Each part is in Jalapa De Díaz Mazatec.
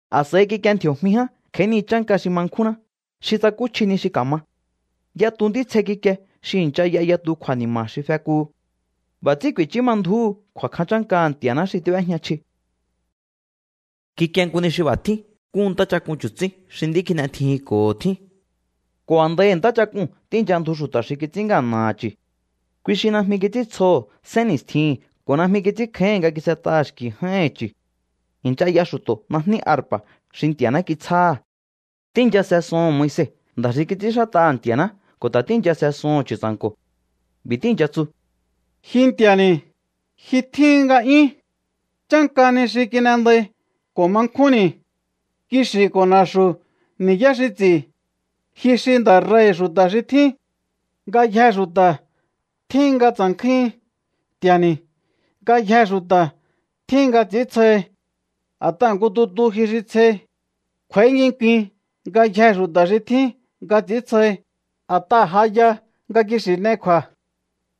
A̱s'a̱i kikie ndji̱o̱jmi ján kj'a̱í ni chánka xi ma nkjúnná, xi tsakúchji ni xi ka̱ma. Yatu ntítsje kikie xi i̱ncha y'a yatu kju̱a̱ni̱ma̱ xi fekuhu. B'a̱ ts'ín ku̱i̱chú ma ndju̱úhu kju̱a̱kjan chánkaha̱ Nti̱a̱ná xi tíb'éjña chji. Kikie nku ni xi b'a̱ tjín nku ntáchak'un chu̱tsín xi nd'í kin'etjijinko̱ho tjín. Ko̱ a̱ndaihi̱ ntáchak'uu̱n tíi̱ncha ndju xu̱ta̱ xi kits'ín ngana̱ha̱ chu̱. Kui xi Najmi kits'íntsjoho̱ sénni̱stjihi̱n ko̱ najmi kits'ínkjáíhi̱n nga kis'et'aha̱ xki̱ j'áíhi̱n chu̱. I̱ncha y'a xu̱to̱ najní arpa̱ xi Nti̱a̱ná kitsjáha̱. Tíi̱ncha se soho̱n Moise, nda̱ xi kits'ínxát'aha̱ Nti̱a̱ná, ko̱ ta̱ tíi̱ncha se soho̱n Chu̱tsa̱nko̱. B'i̱ tíi̱ncha tsu: Ji Nti̱a̱ni̱, ji tjíhi̱n nga'yún. Chánka ni xi kin'endai ko̱ ma nkjúnni̱. Kixi̱ ko̱ na̱xu̱ ni̱yá xi ts'i̱. Ji xi nda̱ rei̱hi̱ xu̱ta̱ xi tjín. Ngayjee̱ xu̱ta̱ tjíhin nga tsa̱nkjúhin, Nti̱a̱ni̱. Ngayjee̱ xu̱ta̱ tjíhin nga ts'i̱íntsjohi. A̱t'aha̱ nku tutu ji xi tsjei. Kj'u̱a̱í nginkuin ngayjee̱ xu̱ta̱ xi tjín nga ts'i̱íntsjohi, a̱t'aha̱ ja ya nga kixi̱ n'ei kju̱a̱.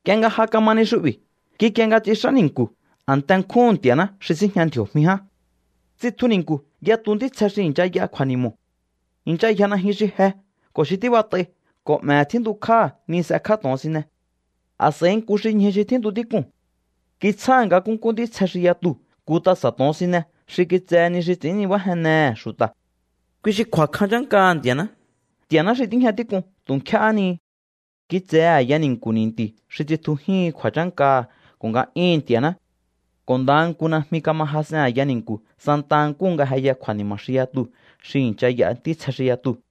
Nk'ie nga ja kama ni xu'bi̱, kikie nga tsix'á ni̱nku̱, a̱nte nkjúhu̱n Nti̱a̱ná xi síjña ndji̱o̱jmi ján. Tsitju ni̱nku̱ yatu ntítsje xi i̱ncha y'a kju̱a̱ni̱mo̱. I̱ncha yja najyun xi je ko̱ xi tíbat'ai ko̱ 'me̱he̱ tjíntukjáha̱ ni s'ekjá to̱onsine. A̱s'a̱i nku xi ñju xi tjíntu tík'uu̱n kitsjáha̱ nga nkúnkú ntítsje xi yatuu̱ nku tasa̱ to̱onsine xi kitsehe ni xi ts'i̱ín nibájennehe̱ xu̱ta̱. Kui xi kju̱a̱kjan chánkaha̱ Nti̱a̱ná, Nti̱a̱ná xi tíjña tík'un tu̱ nkjéhé ni. Kitsehe a̱ya ni̱nku̱ ni̱nti̱ xi tsitjujíhin kju̱a̱chánkaha̱ ko̱ nga'yúhu̱n Nti̱a̱ná, ko̱ ndaha nku najmi kama jas'en a̱ya ni̱nku̱ santa nkúhu nga jeya kju̱a̱ni̱ma̱ xi yatuu̱ xi i̱ncha y'a ntítsje xi yatuu̱.